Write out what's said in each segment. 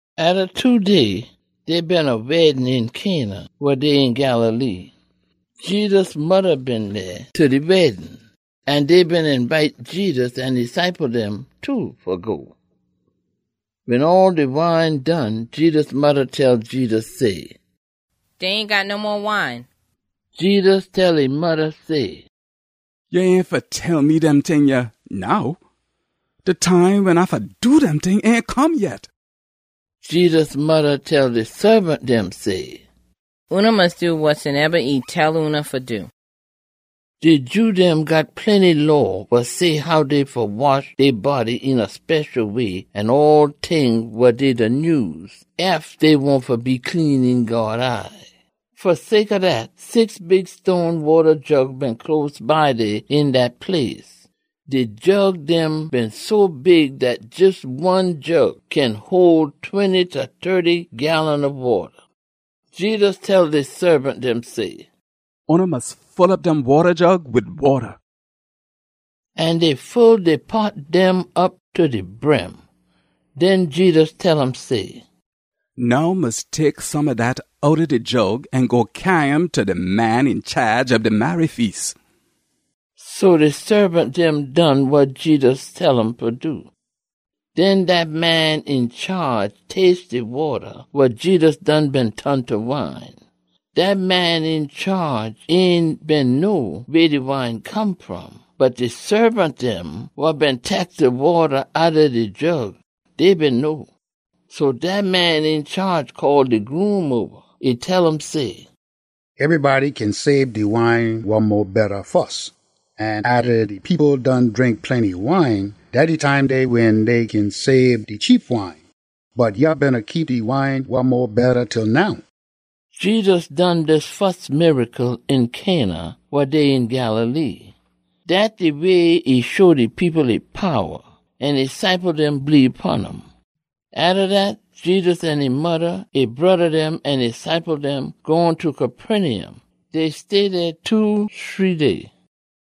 Atta two day, dey been a weddin een Cana, wa dey een Galilee. Jedus modda been dey ta de weddin. An dey been eenbite Jedus an e ciple dem too fa go. Wen all de wine done, Jedus modda tell Jedus say, “Dey ain got no mo wine.” Jedus tell e modda say, “Ya ain fa tell me dem ting yah now. De time wen A fa do dem ting ain come yet.” Jedus modda tell de saabant dem say, “Oona mus do wasoneba e tell oona fa do.” De Jew dem got plenty law wa say how dey fa wash dey body een a special way an all ting wa dey da nyuse, ef dey wahn fa be clean een God eye. Fa sake ob dat, six big stone wata jug been close by dey een dat place. De jug dem been so big dat jes one jug kin hole twenty ta tirty gallon ob wata. Jedus tell de saabant dem say, “Oona mus full op dem wata jug wid wata.” An dey full de pot dem op ta de brim. Den Jedus tell um say, “Now mus tek some ob dat outta de jug an go cyaa um ta de man een chaage ob de marry feas.” So de saabant dem done wa Jedus tell um fa do. Den dat man een chaage taste de wata wa Jedus done been ton ta wine. Dat man een chaage ain been know weh de wine come fom, bot de saabant dem wa been tek de wata outta de jug, dey been know. So dat man een chaage call de groom oba. E tell um say, “Ebrybody kin saab de wine wa mo betta fus, an atta de people done drink plenty wine, dat de time dey wen dey kin saab de cheap wine. Bot ya beena keep de wine wa mo betta til now.” Jedus done dis fus miracle een Cana, wa dey een Galilee. Dat de way e show de people e powa, an e ciple dem bleebe pon um. Atta dat, Jedus an e modda, e broda dem, an e ciple dem gone ta Capernaum. Dey stay dey two, shree day.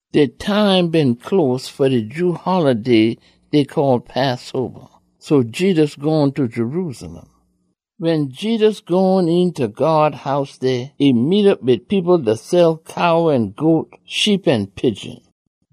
De time been close fa de Jew holiday dey call Passoba, so Jedus gone ta Jerusalem. Wen Jedus gone eenta God House dey, e meet op wid people da sell cow an goat, sheep an pigeon.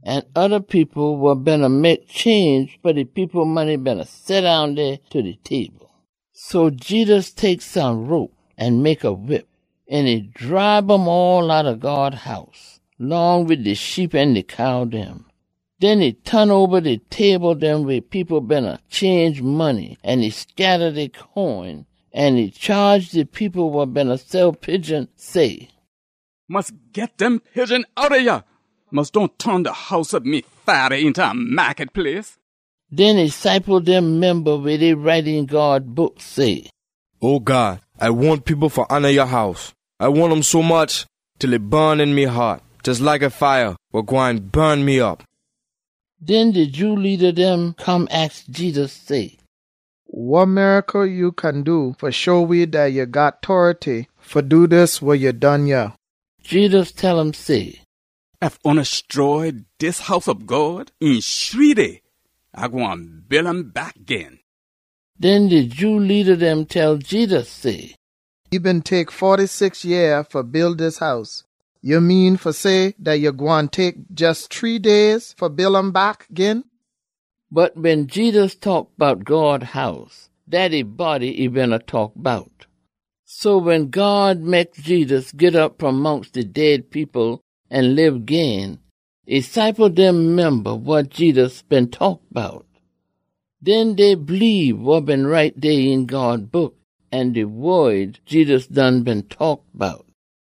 An oda people wa beena mek change fa de people money beena seddown dey ta dey table. So Jedus tek some rope an mek a whip, an e dribe um all outta God House, long wid de sheep an de cow dem. Den e ton oba de table dem weh people beena change money an e scatta dey coin. An e chaage de people wa beena sell pigeon, say, “Mus git dem pigeon outta yah! Mus dohn ton de House ob me Fada eenta a maakut place!” Den e ciple dem memba weh dey write een God Book say, “O God, A wahn people fa hona ya House. A wahn um sommuch til e bun een me haat jes like a fire wa gwine bun me op.” Den de Jew leada dem come aks Jedus say, “Wa miracle ya kin do fa show we dat ya got tority fa do dis wa ya done yah?” Jedus tell um say, “Ef oona stroy dis House ob God, een shree day A gwine build um back gin.” Den de Jew leada dem tell Jedus say, “E been tek foty-six yeah fa build dis House. Ya mean fa say dat ya gwine tek jes shree day fa build um back gin?” Bot wen Jedus taak bout God House, dat e body e beena taak bout. So wen God mek Jedus git op fom mongst de dead people an lib gin, e ciple dem memba wa Jedus been taak bout. Den dey bleebe wa been write dey een God Book an de wod Jedus done been taak bout.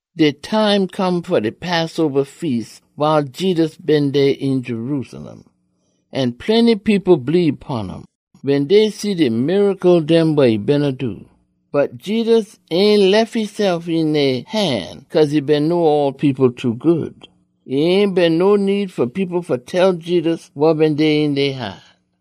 De time come fa de Passoba Feas wiles Jedus been dey een Jerusalem. An plenty people bleebe pon um, wen dey see de miracle dem wa e beena do. Bot Jedus ain lef esef een dey han cause e been know all people too good. E ain been no need fa people fa tell Jedus wa been dey een dey haat.